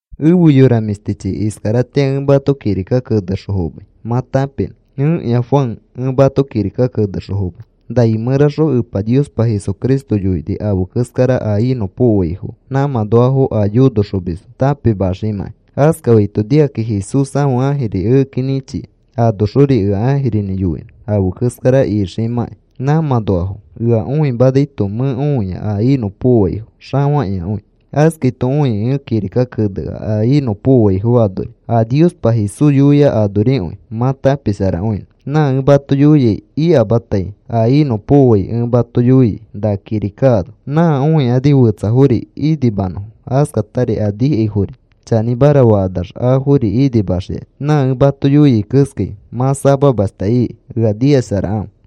Efe yora mĩshtichi, iskaratĩa ẽ mato kirika kenexõ fomai mã tãpinõ. Ẽkĩa Juan ẽ mato kirika kenexõ fomai. Nai mẽraxõ Epa Niospa Jesucristo yoini afe keskara a inõpokoaifo nãmãnoafo a yonoxomisfo tãpimaximãkai. Askafaito nikakĩ Jesús ãfe ãjiri ekeki nĩchia. Anoxori ea ãjirinĩ yoinõ afe keskara ikimãkai nãmãnoafo. Ea õimanaito mẽ õia a inõpokoaifo xafakĩakõi. Askaito õikĩ ẽ kirika kenea a inõpokoaifo anori a Niospa Jesús yoia anorikõi mã tãpisharakõinõ. Na ẽ mato yoiai ikataima. A inõpokoai ẽ mato yoiai na kirika ano. Nã õikani fetsafori inimanõfo. Askatari a nikaifori chanĩmara fakanax, afori inimaxikani. Nã ẽ mato yoiai keskai mã samamashta iki. Ea nikasharakãfe.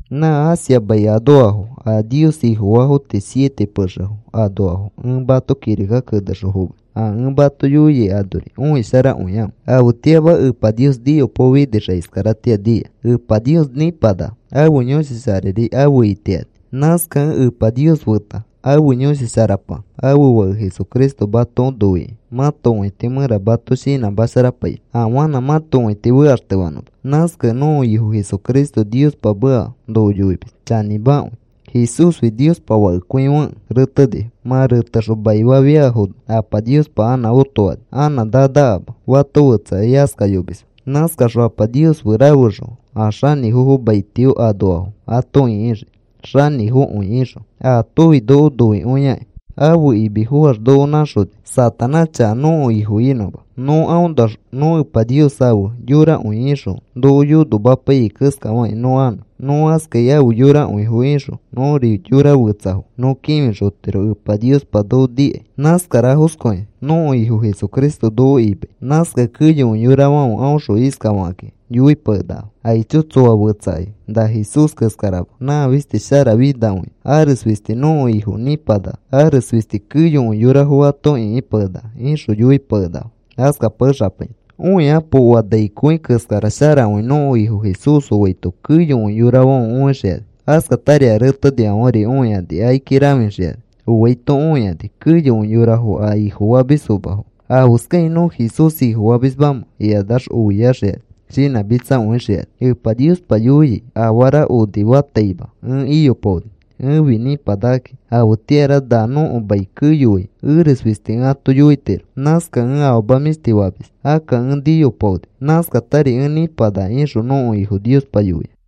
Nã Asia mai anoafo a Nios Ifofaafo tii siete pexefo anoafo ẽ mato kirika kenexõ fomai. A ẽ mato yoiai anori õisharakõikãfe. Afetĩama Epa Nios niyopaofinixakĩ iskaratĩa nia. Epa Nios nĩpanaka. Ãfe Yõshi Sharari afe itiani. Nãskakẽ Epa Nios feta ãfe Yõshi Sharapa, ãfe Fake Jesucristo mato noikĩ mãto õiti mẽra mato shinãmasharapainõ afanã mãto õiti fekaxtefanõma. Nãskakẽ nõko Ifo Jesucristo Niospa meka noko yoimis chanĩmakõi. Jesúsfi Niospa Fakekõifekẽ retenifo. Mã retexõ maifafiafono Apa Niospa anã otofani anã nanakama. Fato fetsa askayomisma. Nãskaxõ Apa Nios fe rafexõ a xanĩfofo maitio anoafo ato ĩkixii xanĩfokõi ixõ. Aatofi noko noikõiakĩ, ãfe imi foax noko nãxoni Satanás chaka nõko ifo inõma. Nõ aõnoax nõ Epa Nios afe yorakõi ixõ noko yonomapaiyai keskafakĩ nõ anõ. Nõ askai afe yorakõifo ixõ nõri yora fetsafo nõ kĩfixotiro Epa Niospa noko nikai. Nãskarafoskõi nõko Ifo Jesucristo noko imai. Nãskakẽ keyokõi yorafãfe aõxõ iskafakakĩ yoipakenakafo: “Aicho, tsoa fetsakai na Jesús keskarama. Nã fisti sharafinakõia. Ares fisti nõko Ifo nĩpanaka. Ares fisti keyokõi yorafo ato ĩkipakenaka,” ixõ yoipakenakafo. Askapakexapainõ. Õikapo. Oa nai kõi keskara sharakõi nõko Ifo Jesús oaito keyokõi yorafãfe õixikani. Askatari a retenifãferi õikani, akiki rãfixikani. Oaito õikani keyokõi yorafo a Ifofamisfomafo, “¿Afeskakĩ nõ Jesús Ifofamismamẽ?” ikanax oiaxikani, shinãmitsakõixikani. Epa Niospa yoia: “Afara onifataima ẽ iyopaoni. Ẽfi nĩpanakakĩ. Afetĩara na nõko mai keyoai eres fisti ẽ ato yoitiro. Nãskaxõ ẽ afama mĩshti famis. Akka ẽ niyopaoni. Nãskatari ẽ nĩpanaka,” ixõ nõko Ifo Niospa yoia.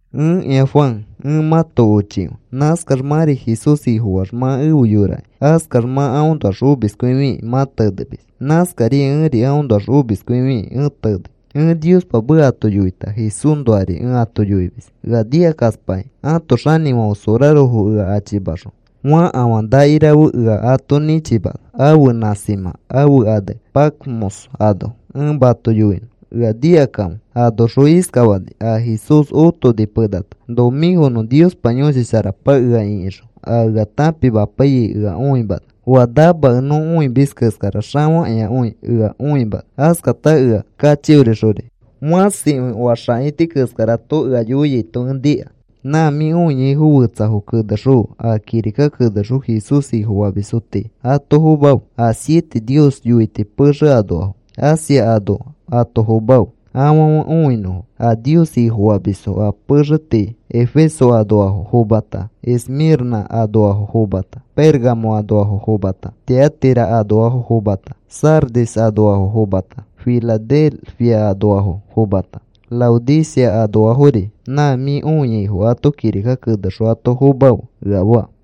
Ẽkĩa Juan, ẽ mãto ochikõi. Nãskax mãri Jesús Ifofaax mã efe yorakĩ. Askax mã aõnoax omiskõifikĩ, mã tenemis. Nãskariai ẽri aõnoax omiskõifikĩ ẽ tenei. Ẽ Niospa meka ato yoita Jesúsnoari ẽ ato yoimis. Ea nikakaspakakĩ, ãto xanĩfãfe sorarofo ea achimaxõ, fakafã nakirafe ea ato nĩchimana ãfe nãsimã, ãfe ane Patmos ano. Ẽ mato yoinõ, ea nikakãfe. Anoxõ iskafani. A Jesús otoni penata, nomĩkonõ, Niospa Yõshi Sharapa ea ĩkixõ a ea tãpimapaiyai ea õimana. Oa namakẽ nõ õimis keskara xafakĩakõi ea õimana. Askata ea kachiorixori fãsikõi oa xãaiti keskarato ea yoiaito ẽ nika. “Nã mĩ õiaifo fetsafo kenexõfe. A kirika kenexõ Jesús Ifofamisfo tii ato fomafe. A siete Nios yoiti pexe anoafo Asia anoa ato fomafe, afãfe õinõfo. A Nios Ifofamisfo a pexe tii Efeso anoafo fomata, Esmĩrnã anoafo fomata, Pérgamo anoafo fomata, Tiatira anoafo fomata, Sardis anoafo fomata, Filadelfia anoafo fomata, Laodicea anoafori nã mĩ õiaifo ato kirika kenexõ ato fomafe,” ea faa.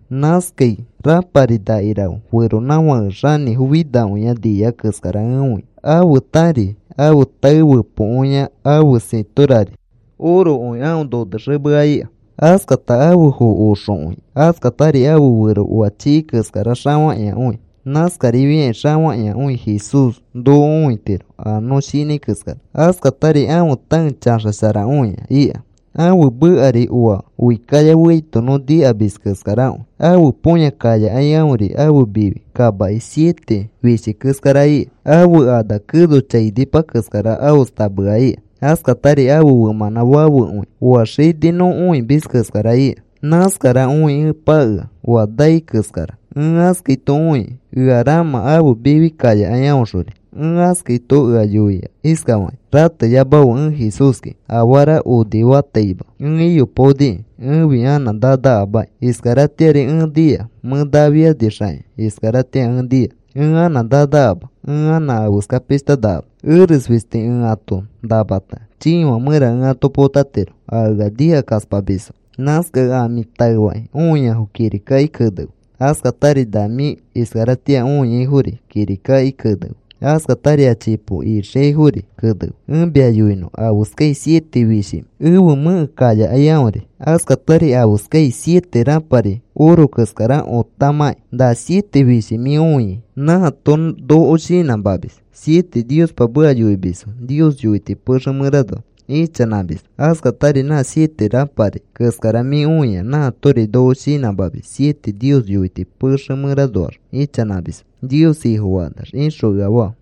Nãskai rãpari nakirafe feronãfake xanĩfo finakõia nia keskara ẽ õia. Ãfe tari ãfe tae fepokõia, ãfe sĩtorari orokõi aõ nonexemea ika. Askata ãfe foo oxokõi. Askatari ãfe fero oa chii keskara xafakĩakõi. (Nãskarifiakĩ xafakĩakõi Jesús noko õitiro a nõ shinãi keskara.) Askatari ãfe taeri chaxasharakõia ika. Ãfe mekari oa oi kaya feaito nõ nikamis keskarakõi. Ãfe põya kayakai aõri ãfe mifi kamaki siete fishi keskara ika. Ãfe ana keno chainipa keskara aostamea ika. Askatari ãfe femãnã fafekõi oa xini nõ õimis keskara ika. Nãskara õi ẽ pakea, oa nai keskara. Ẽ askaito õikĩ ea ramã ãfe mifi kayakai aõxori. Ẽ askaito ea yoia iskafakĩ: “Rateyamafe. Ẽ Jesúski. Afara onifataima ẽ iyopaoniki. Ẽfi anã nanakamaki. Iskaratĩari ẽ nia. Mẽ nafianixakĩ, iskaratĩa ẽ nia. Ẽ anã nanakama. Ẽ anã afeska pishta nakama. Eres fisti ẽ ato namata, chiifã mẽra ẽ ato potatiro a ea nikakaspamisfo. Nãskakẽ a mĩ taefakĩ õiafo kirikaki kenefe. Askatari na mĩ iskaratĩa õiaifori kirikaki kenefe. Askatari a chipo ixiaifori kenefe. Ẽ mia yoinõ afeskai siete fishimẽ ẽfe mẽke kayakai aõri; askatari afeskai siete rãpari oro keskara otamãki. Na siete fishi mĩ õiai nãato noko shinãmamis siete Niospa meka yoimisfo Nios yoiti pexe mẽranoa ichanãmisfo. Askatari nã siete rãpari keskara mĩ õiai nãatori noko shinãmamis siete Nios yoiti pexe mẽranoax ichanãmisfo Nios Ifofakanax,” ixõ ea faa.